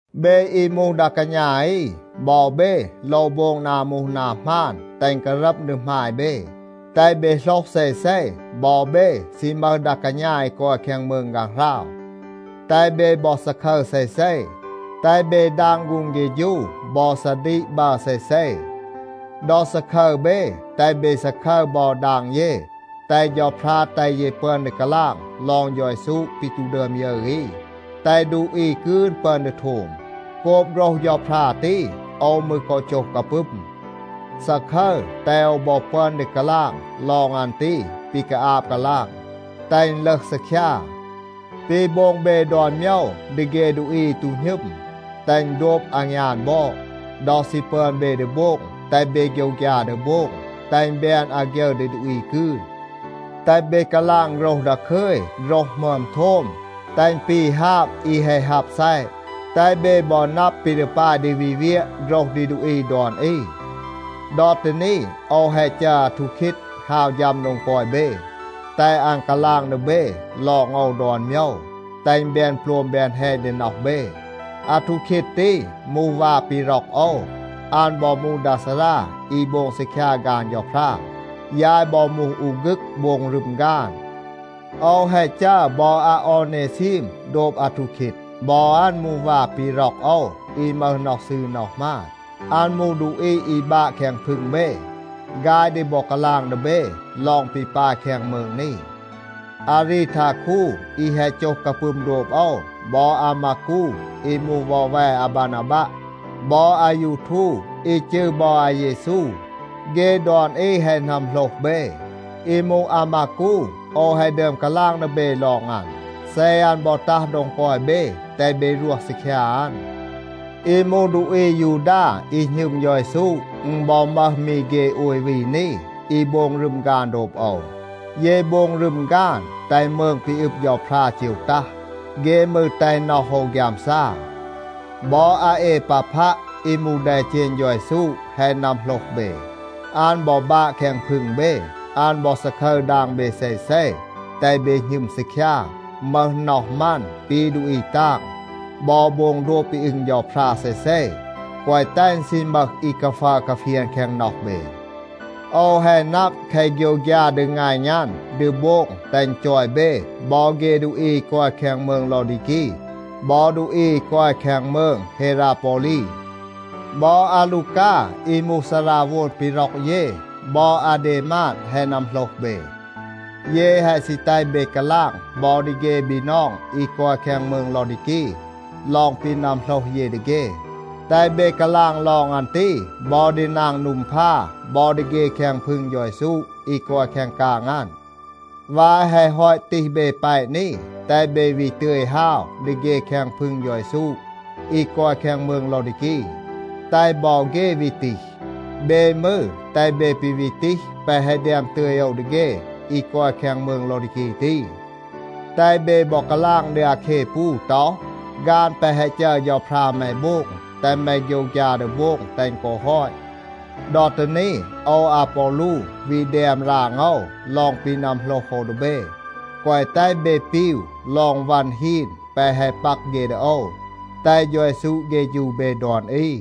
เบ อี มูห ดา กาณา อี, บอ เบ โลว โบง นา มูห นา หมาน, แตห อึณ การัม ดี หมาย เบ. แตห เบ โหลห เซเซ, บอ เบ ซี มึห ดา กาณา อี กอย แคง มืง ฆางหราว. แตห เบ บอ ซาคึร เซเซ. แตห เบ ดาง ฆูง เฆฌู บอ ซาดีก บัร เซเซ. ดอ ซาคึร เบ, แตห เบ ซาคึร บอ ดาง เย, แตห เฌาพรา แตห เย ปึอน ดี กาลาง ลอง เฌา เยซู ปี ตู ดึอม ยึร อี, แตห ดูอี กืน ปึอน ดี โทม. โกบ โฆรห เฌาพรา ตี, โอว มืร กอ โจห กาปึม. ซาคึร, แตห โอว บอ ปึอน ดี กาลาง ลอง อัน ตี ปี กาอาบ กาลาง, แตห อึณ ลึห ซีคยา. ปี โบง เบ ดอน โมยว ดี เฆ ดูอี อี ตู หณึม, แตห อึณ โดบ อางยาน บอด. ดอ ซี ปึอน เบ ดี โบง, แตห เบ โฆยวฆยา ดี โบง, แตห อึณ แบน อาฆยึร ดี ดูอี กืน. แตห เบ กาลาง โฆรห ดาคึย, โฆรห หมึอม โทม, แตห อึณ ปี ฮาบ อี แฮะ ฮับ ซัยะ. แตห เบ บอ นับ ปี ดี ปาย ดี วี เวียะ โฆรห ดี ดูอี ดอน อี. ดอ ตี นี, โอว แฮะ จัร อาทูคีด ฮาว ฌัม โดง กอย เบ, แตห อัน กาลาง ดี เบ ลอง โอว ดอน โมยว, แตห อึณ แบน โปลม แบน แฮณ ดี น็อห เบ. อาทูคีด ตี มูห วา ปี ร็อก โอว, อัน บอ มูห ดา ซารา อี โบง ซีคยา ฆาน เฌาพรา. ยาย บอ มูห อู ฆึก โบง รึม ฆาน. โอว แฮะ จัร บอ อาออเนซีม โดบ อาทูคีด. บอ อัน มูห วา ปี ร็อก โอว อี มึห น็อห ซืร น็อห หมาน. อัน มูห ดูอี อี บาะ แคง พึง เบ. ฆาย ดี บอ กาลาง ดี เบ ลอง ปี ปาย แคง มืง นี. อารีทาคู อี แฮะ โจห กาปึม โดบ โอว บอ อามากู อี มูห วอแว อาบานาบัะ บอ อายูทู อี จืร บอ อาเยซู. เฆ ดอน อี แฮะ นัมโหลห เบ. อี มูห อามากู, โอว แฮะ ดึอม กาลาง ดี เบ ลอง อัน. เซ อัน บอ ตัห โดง กอย เบ, แตห เบ รวห ซีคยา อัน. อี มูห ดูอี อายูดา อี หณึม เฌา เยซู, อึณ บอ มึห มี เฆ โอย วี นี, อี โบง รึม ฆาน โดบ โอว. เย โบง รึม ฆาน, แตห มืง ปี อึบ เฌาพรา เจว ตัห. เฆ มืร แตห น็อห โอว ฆยามซา. บอ อาเอปาพัะ อี มูห แดเจณ เฌา เยซู แฮะ นัมโหลห เบ. อัน บอ บาะ แคง พึง เบ. อัน บอ ซาคึร ดาง เบ เซเซ, แตห เบ หณึม ซีคยา, มึห น็อห มัน ปี ดูอี ตาง, บอ โบง โดบ ปี อึง เฌาพรา เซเซ, แกวะ แตห อึณ ซี มึห อี กาฟัร กาเฟียน แคง น็อห เบ. โอว แฮะ นับ แคะ โฆยวฆยา ดีงัณ อัน ดี โบง แตห อัน จอย เบ บอ เฆ ดูอี อี กอย แคง มืง ลอดีกี บอ ดูอี อี กอย แคง มืง เฮราปอลี. บอ อาลูกา อี มูห ซาราโวน ปี ร็อก เย, บอ อาเดมาด แฮะ นัมโหลห เบ. เย แฮะ ซี แตห เบ กาลาง บอ ดี เฆ บีนอง อี กอย แคง มืง ลอดีกี ลอง ปี นัมโหลห เย ดี เฆ. แตห เบ กาลาง ลอง อัน ตี บอ ดี นาง นูมพา บอ ดี เฆ แคง พึง เฌา เยซู อี กอย แคง กาง อัน. วาย แฮะ ฮอต ตีห เบ แปะ นี, แตห เบ วี ตึย ฮาว ดี เฆ แคง พึง เฌา เยซู อี กอย แคง มืง ลอดีกี, แตห บอ เฆ วี ตีห. เบ มืร, แตห เบ ปี วี ตีห แปะ แฮะ แดม ตึย โอว ดี เฆ อี กอย แคง มืง ลอดีกี ตี. แตห เบ บอ กาลาง ดี อาแคปู ต็อห, “ฆาน แปะ แฮะ จัร เฌาพรา แม โบง, แตห แม โฆยวฆยา ดี โบง แตห อึณ กอ ฮอต.” ดอ ตี นี, โอว อาปอลู วี แดม ราง โอว ลอง ปี นัมโหลห โอว ดี เบ. แกวะ แตห เบ ปีว ลอง วัน ฮีน แปะ แฮะ ปัก เฆ ดี โอว. แตห เฌา เยซู เฆฌู เบ ดอน อี.